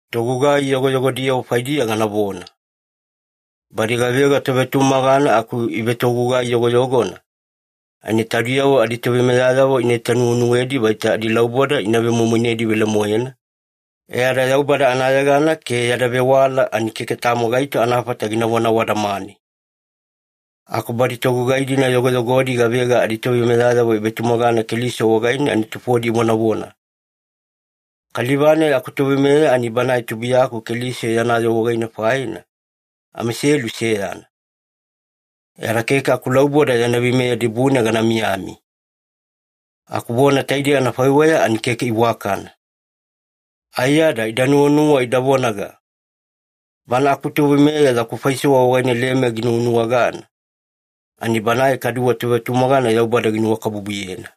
Togugai yogoyogodiyavo faidiya ganavona. Badi gavega tovetumagana aku ivetogugai yogoyogona, ani taudiyavo aditoveimeyayavo ina itanuwenuwedi vaita adilauboda ina vemoimoinedi velemoena, e ada Yaubada anayegana ke yada vewala ani keke tamo gaito anafata ginavona awadamane. Aku badi togugai-dina yogoyogodi gavega aditoveimeyayavo ivetumagana Keliso wagaine ani tufodi ivonavona, “Kaliva-nai akutoveimeya ani banae tubuiyaku Keliso yana yoo wagaine faina, amaiselu seyana. E ada keke akulauboda yana veimeya dibune gana miyamiya.” Aku vona taide anafaiweya ani keke iwakana. Aiyada ida nuwanuwa ida vonaga, “Bana akutoveimeya yaku faisewa wagaine leme ginuwanuwagana, ani banae kaduwe tovetumagana Yaubada ginuwakabubuyena.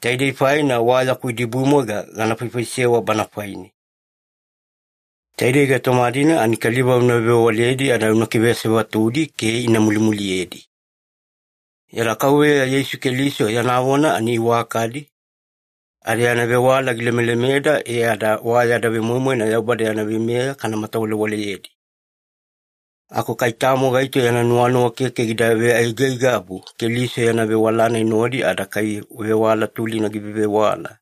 Taidei faina wa yaku idibumwaiga gana faifaisewa bana faine.” Taidei gaitoma-dina ani kaliva una vevewaledi ada una kiveasevatudi ke ina mulimuliyedi. Yada Kauveya Yeisu Keliso yana vona ani iwakadi, ada yana vewala gilemelemeda e ada wa yada vemoimoina Yaubada yana veimeya kana matawalewaleyedi. Aku kai tamo gaito yana nuwanuwa keke gida veaigaigabu Keliso yana vewala-nai nodi ada kai vewala tulina givevewala,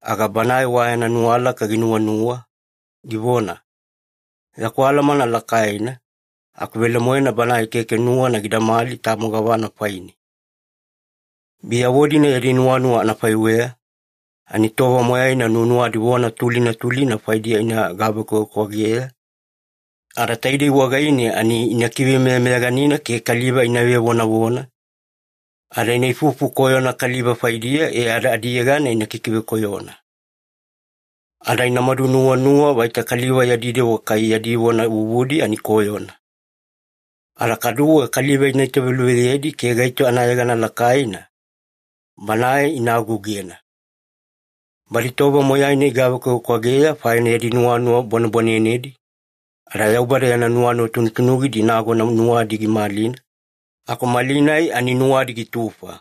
aga banae wa yana nuwalaka ginuwanuwa, givona, “Yaku alamana lakaina,” aku velemoena banae keke nuwana gidamali tamo gavana faine. Biyavo-dina yadi nuwanuwa anafaiweya, ani tova moyaina nuwanuwadi vona tulina tulina faidiya ina gavekwavekwageya, ada taidei wagaine ina kivemeyameyaganina ke kaliva ina vevonavona, ada ina ifufu koyona kaliva faidiya e ada adiyegana ina kikivekoyona. Ada inamadu nuwanuwa vaita kaliva yadi dewa kai yadi vona vuvudi ani koyona. Ada kaduwe kaliva ina italuveyedi ke gaito anayegana lakaina, banae ina agougena. Badi tova moyaina igavekwavekwageya faina yadi nuwanuwa bwanebwanenedi, ada Yaubada yana nuwanuwa tunutunugidi nagona nuwadi gimalina, aku malinai ani nuwadi gitufa.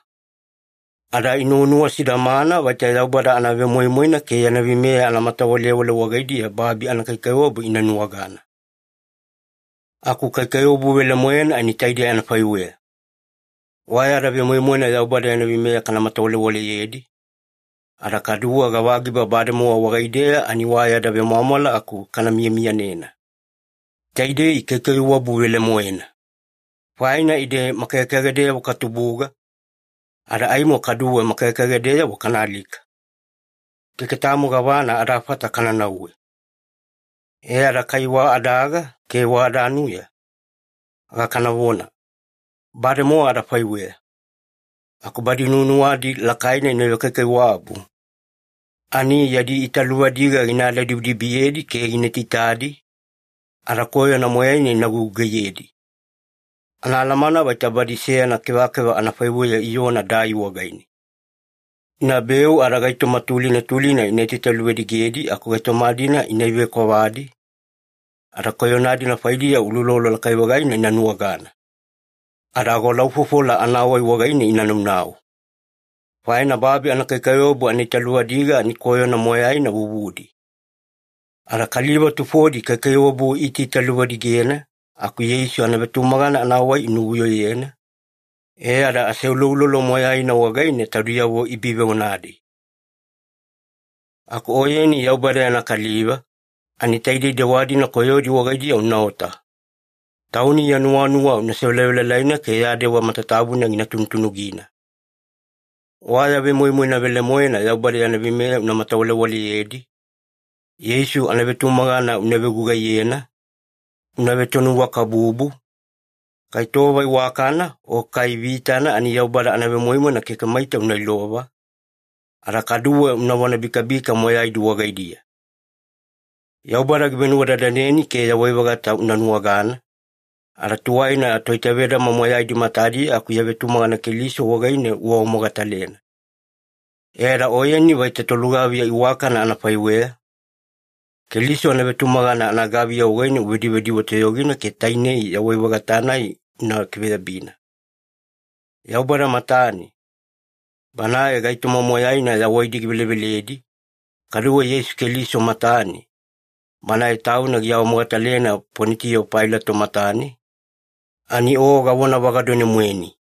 Ada inuwanuwa sidamana vaita Yaubada anavemoimoina ke yana veimeya anamatawalewale wagaidiya babi anakaikaiwabu ina nuwagana. Aku kaikaiwabu velemoena ani taidei anafaiweya. Wa yada vemoimoina Yaubada yana veimeya kana matawalewaleyedi, ada kaduwe gavagiba bademowa wagaideya ani wa yada vemwamwala aku kana miyamiyanena. Taidei kaikaiwabu velemoena. Faina ide makagekagedeyavo katubuga, ada aimo kaduwe makagekagedeyavo kana alika. Keke tamo gavana adafata kana nauwe. E ada kai wa adaga ke wa adanuya, aga kanavona, “Bademowa adafaiweya.” Aku badi nuwanuwadi lakaina ina vekaikaiwabu, ani yadi italuvadiga gina aladibidibiyedi ke gina taitaidi, ada koyona moyaina ina gugugaiyedi. Anaalamana vaita badi seyana kevakeva anafaiweya iona dai wagaine. Inabeu ada gaitoma tulina tulina ina itaitaluvadigedi aku gaitoma-dina ina ivekwavadi, ada koyona-dina faidiya uloulolo lakai-vagaina ina nuwagana. Ada agolaufofola anawai wagaine ina naunau. Faina babi anakaikaiwabu anaitaluvadiga ani koyona moyaina vuvudi. Ada kaliva tufodi kaikaiwabu iitaitaluvadigena aku Yeisu anavetumagana anawai inuvuyoyena, e ada aseuloulolo moyaina wagaine taudiyavo ibiveonadi. Aku oyeni Yaubada yana kaliva, ani taidei dewa-dina koyodi wagaidiya unaota. Tauni ya nuwanuwa una sevelavelalaina ke ya dewa matatabuna gina tunutunugina. Wa ya vemoimoina velemoena Yaubada yana veimeya una matawalewaleyedi, Yeisu anavetumagana una vegugaiyena, una vetonuwakabubu, kai tova iwakana o kai vitana ani Yaubada anavemoimoina keke maita una ilova, ada kaduwe unavona bikabika moyaidi wagaidiya. Yaubada givenuwadadaneni ke yawai-vagata una nuwagana, ada tuwaina toitavedama moyaidi matadiya aku ya vetumagana Keliso wagaine uawamogatalena. E ada oyeni vaita tolugaviya iwakana anafaiweya, Keliso anavetumagana anagaviya wagaine una vedivediwe toyogina ke tainei yawai-vagata-nai una kiveyabina. Yaubada matane, Banae gaitoma moyaina yawaidi giveleveledi, kaduwe Yeisu Keliso matane, Banae Tauna giawamogatalena Ponitiyo Pailato matane, ani o gavonavagadone-moeni.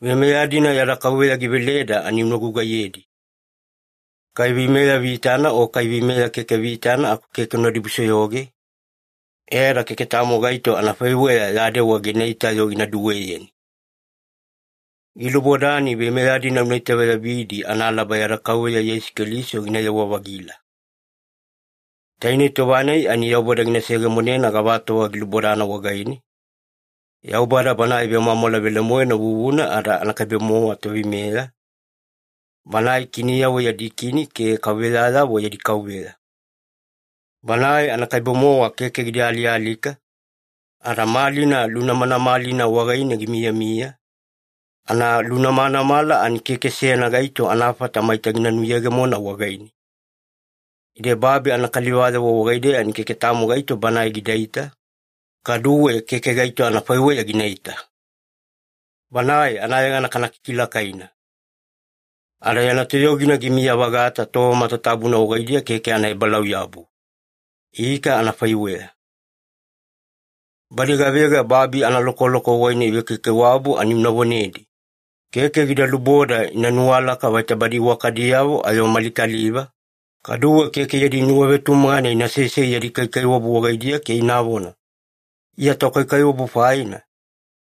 Veimeya-dina yada Kauveya giveleda ani una gugaiyedi. Kai veimeya vitana o kai veimeya keke vitana aku keke una dibusoyoge, e ada keke tamo gaito anafaiweya ya dewa ginaita-yo gina duweyeni. Gilubodani veimeya-dina una itaveyabidi analaba yada Kauveya Yeisu Keliso ginayewa-vagila. Tainei tova-nai ani Yaubada gina seyegemonena gavatova gilubodana wagaine, Yaubada Banae vemwamwala velemoena vuvuna ada anakaibe-mowa Toveimeya, Banae kiniyavo yadi Kini ke kauveyayavo yadi Kauveya. Banae anakaibe-mowa keke gida alialika, ada malina lunamanamalina wagaine gimiyamiya, analunamanamala ani keke seyana gaito anafata maita gina nuyegemona wagaine. Ide babi anakalivayavo wagaideya ani keke tamo gaito Banae gidaita, kaduwe keke gaito anafaiweya ginaita. Banae anayegana kana kikilakaina! Ada yana toyogina gimiya-vagata tova matatabuna wagaidiya keke anaebalauyabu. Ika anafaiweya. Badi gavega babi analokoloko wagaine ivekaikaiwabu ani una vonedi, keke gida luboda ina nuwalaka vaita badi iwakadiyavo ayo mali kaliva, kaduwe keke yadi nuwavetumagana ina sesei yadi kaikaiwabu wagaidiya ke inavona, “Iya tokaikaiwabu faina,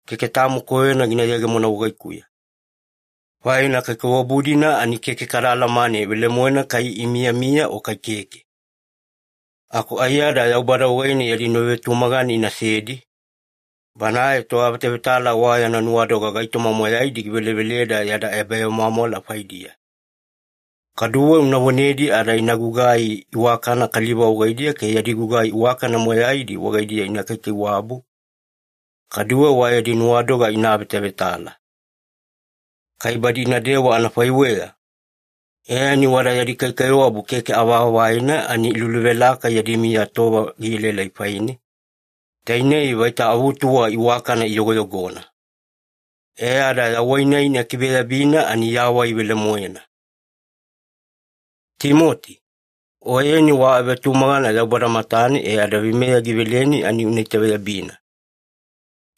keke tamo koyona gina yegemona wagaikuya.” Faina kaikaiwabu-dina ani keke kada alamane velemoena kai ina miyamiya o kai keke. Aku aiyada Yaubada wagaine yadi nuwavetumagana inasedi, Banae Toavetavetala wa yana nuwadoga gaitoma moyaidi giveleveleda yada ebavemwamwala faidiya. Kaduwe una vonedi ada ina gugai iwakana kaliva wagaidiya ke yadi gugai iwakana moyaidi wagaidiya ina kaikaiwabu, kaduwe wa yadi nuwadoga ina avetavetala. Kai badi inadewa anafaiweya, e ani wada yadi kaikaiwabu keke avaavaina ani iluluvelaka yadi miya tova gielaelai faine, tainei vaita avutuwa iwakana iyogoyogona. E ada yawai-nai ina kiveyabina ani yawai velemoena. Timoti, oyeni wa avetumagana Yaubada matane e ada aveimeya giveleni ani una itaveyabina.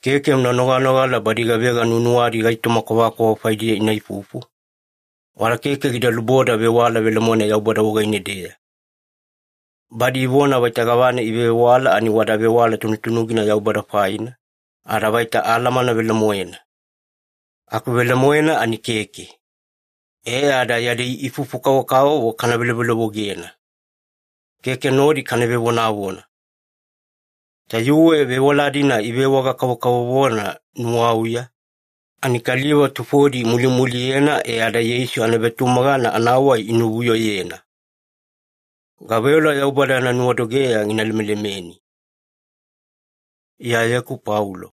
Keke una noganogala badi gavega nuwanuwadi gaitoma kwavakwava faidiya ina ifufu, wada keke gida luboda vewala velemoena Yaubada wagaine-deya. Badi ivona vaita gavana ivevewala ani wada vewala tunutunugina Yaubada faina, ada vaita ‘alamana velemoena’. Aku velemoena ani keke. E ada yadi ifufu-kavokavovo kana velovelovogena. Keke nodi kana vevonavona. Tayuwe vewala-dina ivewaga-kavovona ‘nuwauya’, ani kaliva tufodi imulimuliyena e ada Yeisu anavetumagana anawai inuvuyoyena. Gaveola Yaubada yana nuwadogeya gina lemelemeni. Iyayeku Paulo